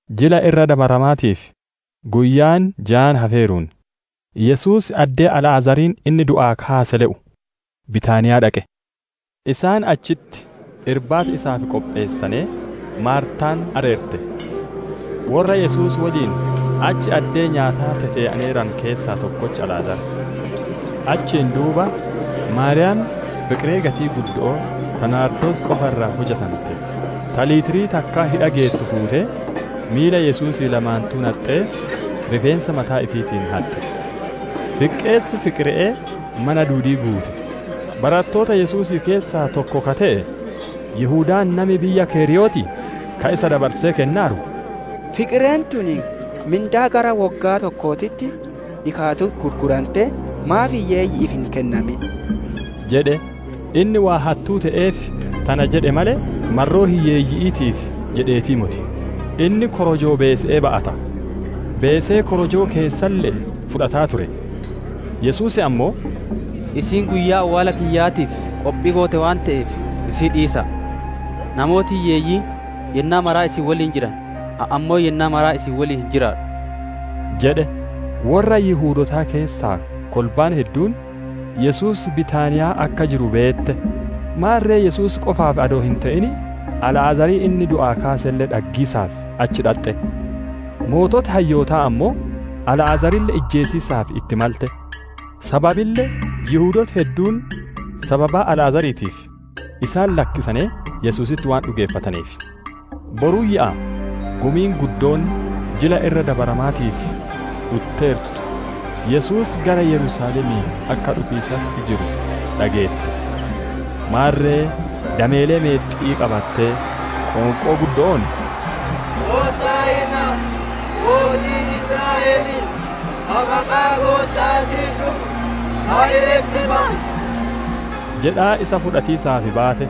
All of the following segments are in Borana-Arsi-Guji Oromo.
Jila Irra Dabaramaatiif guyyaan jaan hafeeruun, Yesuus addee Alaazariin inni du'aa kaase le'u, Bitaaniyaa dhaqe. Isaan achitti irbaata isaaf qopheessanee, Maartaan areerte; worra Yesuus woliin achi addee nyaataa tetee'aneeranu keessaa tokkochi Alaazar. Achiin duuba Maariyaam fiqiree gatii guddo'oo ta Naardoos qofa irraa hujante ta litirii takkaa hidha geettu fuutee, miila Yesuusii lamaanittuu naxxee, rifeensa mataa ifiitiin haxxe. Fiqqeessi fiqire'ee mana duudii guute. Barattoota Yesuusii keessaa tokko ka te'e, Yihudaan nami biyya Keriyootii, ka isa dabarsee kennaaru, «Fiqireen tun mindaa gara woggaa tokkootitti dhikaatu gurgurantee maaf hiyyeeyyi'iif hin kennamin?» jedhe. Inni waan hattuu te'eef, tana jedhe malee, marroo hiyyeeyyi'iitiif jedheetii moti. Inni korojoo beese'ee ba'ata; beesee korojoo keessaalle fudhataa ture. Yesuus ammoo, «Isiin guyyaa awwaala kiyyaatiif qophii goote waan te'eef, isii dhiisa'a. Namooti Hiyyeeyyiin yennaa maraa isin woliin jiran, ani ammoo yennaa maraa isin woliin hin jiraadhu» jedhe. Worra Yihudootaa keessaa Kolbaan hedduun Yesuus Bitaaniyaa akka jiru beette; maarre Yesuus qofaaf adoo hin te'in Alaazarii inni du'aa kaaselle dhaggiisaaf achi dhaxxe. Sooreyyiin hayyootaa ammoo Alaazarille ijjeesiisaaf itti malane; sababille Yihudooti hedduun sababa Alaazariitiif isaan lakkisanee Yesuusitti waan dhugeeffataneef. Boruyyaa Gumiin guddoon Jila Irra Dabaramaatiif dhutteertu Yesuus gara Yerusaalemii akka dhufiisatti jiru dhageette. Maarre dameelee meexxi'ii qabattee, qoonqoo guddo'oon, «Hosaa'inaa! Mootiin Israa'elii ka maqaa Gootta'aatiin dhufu ka eebbifame!» jedhaa isa fudhatiisaaf baate.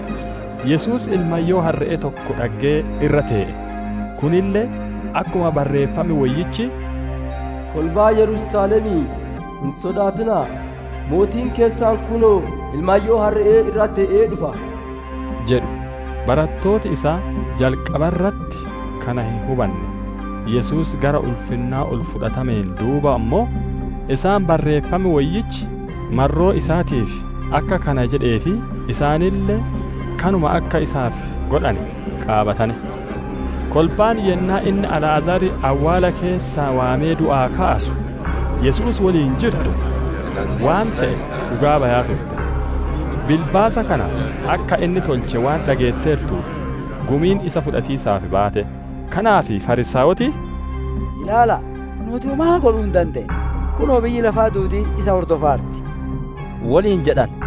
Yesuus ilmayyoo harre'ee tokko dhaggee irra tee'e. Kunille akkuma Barreeffam Woyyichi, «Kolbaa Yerusaalemii, hin sodaatina'a! Mootiin keessan kunoo ilmayyoo harre'ee irra tee'ee dhufa» jedhu. Barattooti isaa jalqaba irratti kana hin hubanne; Yesuus gara ulfinnaa ol fudhatameen duuba ammoo, isaan Barreeffam Woyyichi marroo isaatiif akka kana jedhee fi isaanille kanuma akka isaaf godhane qaabatane. Kolbaan yennaa inni Alaazar awwaala keessaa waamee du'aa kaasu Yesuus woliin jirtu waan te'e dhugaa bayaa turte. Bilbaasa kana akka inni tolche waan dhageetteertuuf gumiin isa fudhatiisaaf baate. Kanaaf Fariisaayoti, «Ilaala'a, nuuti womaa godhuu hin dandeenne! Kunoo, biyyi lafaa duudiin isa hordofaarti!» woliin jedhane.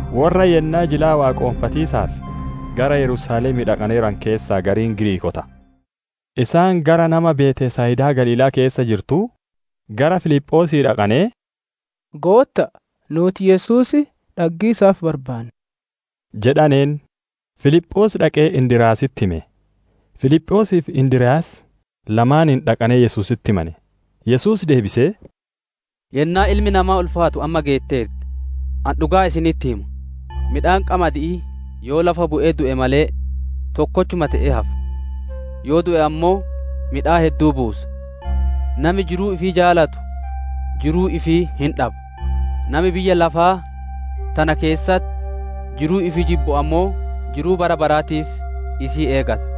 Worra yennaa jilaa waaqonfatiisaaf gara Yerusaalemii dhaqaneeranu keessaa gariin Giriikoota. Isaan gara nama Betsayidaa Galiilaa keessa jirtuu, gara Filiphoosii dhaqanee, «Gootta'a, nuuti Yesuus dhaggiisaaf barbaanna» jedhaneen. Filiphoos dhaqee Indiryaasitti hime; Filiphoosii fi Indiryaas lamaaniin dhaqanee Yesuusitti himane. Yesuus deebisee, «Yennaan Ilmi Namaa ulfaatu amma geetteerti. Ani dhugaa isinitti hima: Midhaan qamadi'ii yoo lafa bu'ee du'e malee, tokkochuma te'ee hafa. Yoo du'e ammoo, midhaan hedduu buusa. Nami jiruu ifii jaalatu jiruu ifii hin dhaba; nami biyya lafaa tana keessatti jiruu ifii jibbu ammoo jiruu bara baraatiif isii eegata.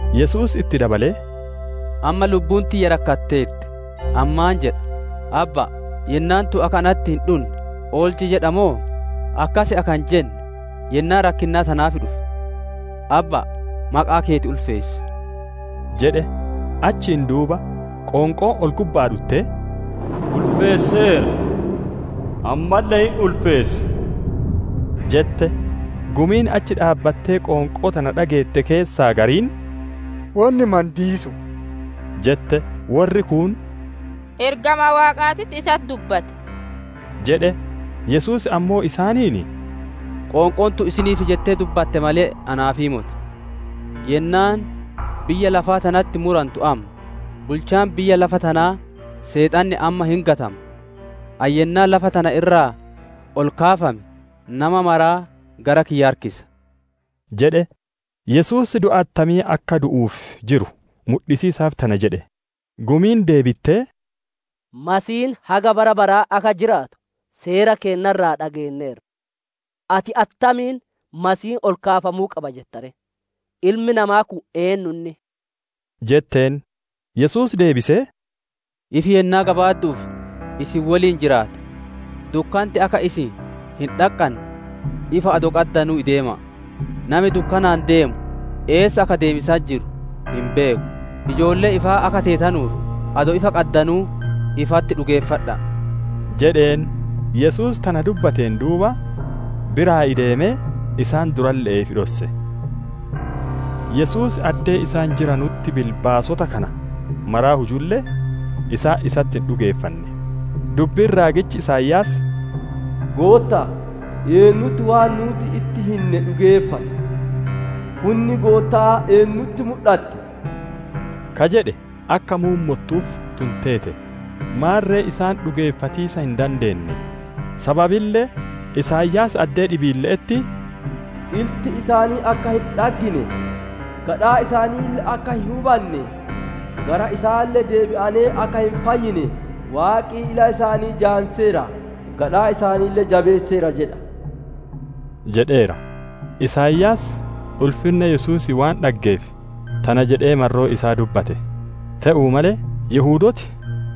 Yesuus itti dabalee, «Amma lubbuun tiyya rakkatteerti, ani maan jedha? ‹Abba'a, yennaan tun akka natti hin dhunne oolchi jedha moo?› Akkas akka hin jenne yennaa rakkinnaa tanaaf dhufe. Abba'a, maqaa keeti ulfeessi!» jedhe. Achiin duuba qoonqoon ol gubba'aa dhuttee, «Ulfeesseera, ammalle hin ulfeessa» jette. Gumiin achi dhaabbattee qoonqoo tana dhageette keessaa gariin, «Wonni mandiisu'u» jette; worri kuun, «Ergamaa Waaqaatitti isatti dubbate» jedhe. Yesuus ammoo isaaniin, «Qoonqoon tun isiniif jettee dubbatte malee, anaafii moti. Yennaan biyya lafaa tanatti murantu amma; bulchaan biyya lafa tanaa Seexanni amma hin gatama. Ani Yennaa lafa tana irraa ol kaafame, nama maraa gara kiyya harkisa» jedhe. Yesuus du'a attamii akka du'uuf jiru mudhisiisaaf tana jedhe. Gumiin deebittee, «Masiihiin haga bara baraa akka jiraatu seera keenna irraa dhageenneerra. Ati attamiin Masiihiin ol kaafamuu qaba jetta ree? Ilmi namaa kun eennu inni?» jetteen. Yesuus deebisee, «Ifi yennaa gabaaddu'uuf isin woliin hin jiraata. Dukkanti akka isin hin dhaqqanne, ifa adoo qaddanuu ideema'a; nami dukkanaan deemu eessa akka deemiisatti jiru hin beeku. Ijoollee ifaa akka teetanuuf, adoo ifa qaddanuu, ifatti dhugeeffadha'a» jedheen. Yesuus tana dubbateen duuba, biraa ideemee isaan duralle'ee ifi dhosse. Yesuus addee isaan jiranutti bilbaasota kana mara hujulle, isaan isatti hin dhugeeffanne. Dubbiin raagichi Isaayaas, «Gootta'a, eennutti waan nuuti itti hinne dhugeeffate? Hunni Gootta'aa eennutti mudhatte?» ka jedhe akka muummottuuf tun teete. Maarre isaan dhugeeffatiisa hin dandeenne, sababille Isaayaas addee dhibiille'etti, «Ilti isaanii akka hin dhaggine, gadhaan isaaniille akka hin hubanne, gara isaalle deebi'anee akka hin fayyine, Waaqi ila isaanii jaamseera; gadhaa isaaniille jabeesseera jedha» jedheera. Isaayaas ulfinna Yesuusii waan dhaggeef tana jedhee marroo isaa dubbate. Te'uu malee, Yihudooti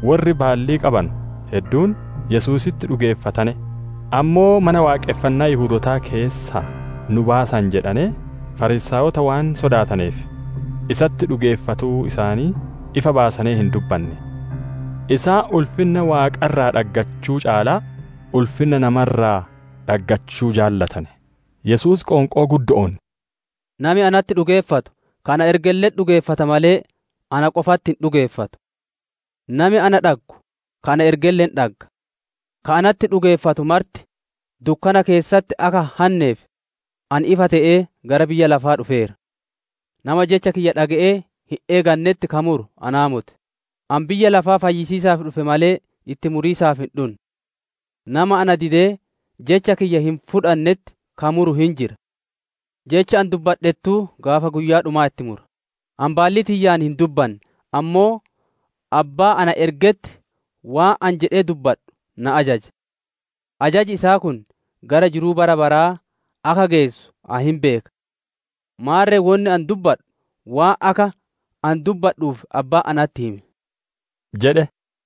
worri baallii qabanu hedduun Yesuusitti dhugeeffatane; ammoo Mana Waaqonfannaa Yihudootaa keessaa nu baasan jedhanee, Fariisaayota waan sodaataneef, isatti dhugeeffatuu isaanii ifa baasanee hin dubbanne. Isaan ulfinna Waaqa irraa dhaggachuu caalaa ulfinna nama irraa dhaggachuu jaalatane. Yesuus qoonqoo guddo'oon, «Nami natti dhugeeffatu ka na ergelle'etti dhugeeffata malee na qofatti hin dhugeeffatu. Nami na dhaggu ka na ergelle hin dhagga. Ka natti dhugeeffatu marti dukkana keessatti akka hin hanneef, ani ifa te'ee gara biyya lafaa dhufeera. Nama jecha kiyya dhage'ee hin eeganetti ka muru anaa moti; ani biyya lafaa fayyisiisaaf dhufe malee, itti muriisaaf hin dhunne. Nama na didee Jecha kiyya hin fudhannetti ka muru hin jira. Jecha ani dubbadhettuu gaafa guyyaa dhumaa itti mura. Ani baallii tiyyaan hin dubbanne; ammoo Abbaa na ergetti waan ani jedhee dubbadhu na ajaje. Ajaji isaa kun gara jiruu bara baraa akka geessu ani hin beeka. Maarre wonni ani dubbadhu, waan akka ani dubbadhuuf Abbaan natti hime» jedhe.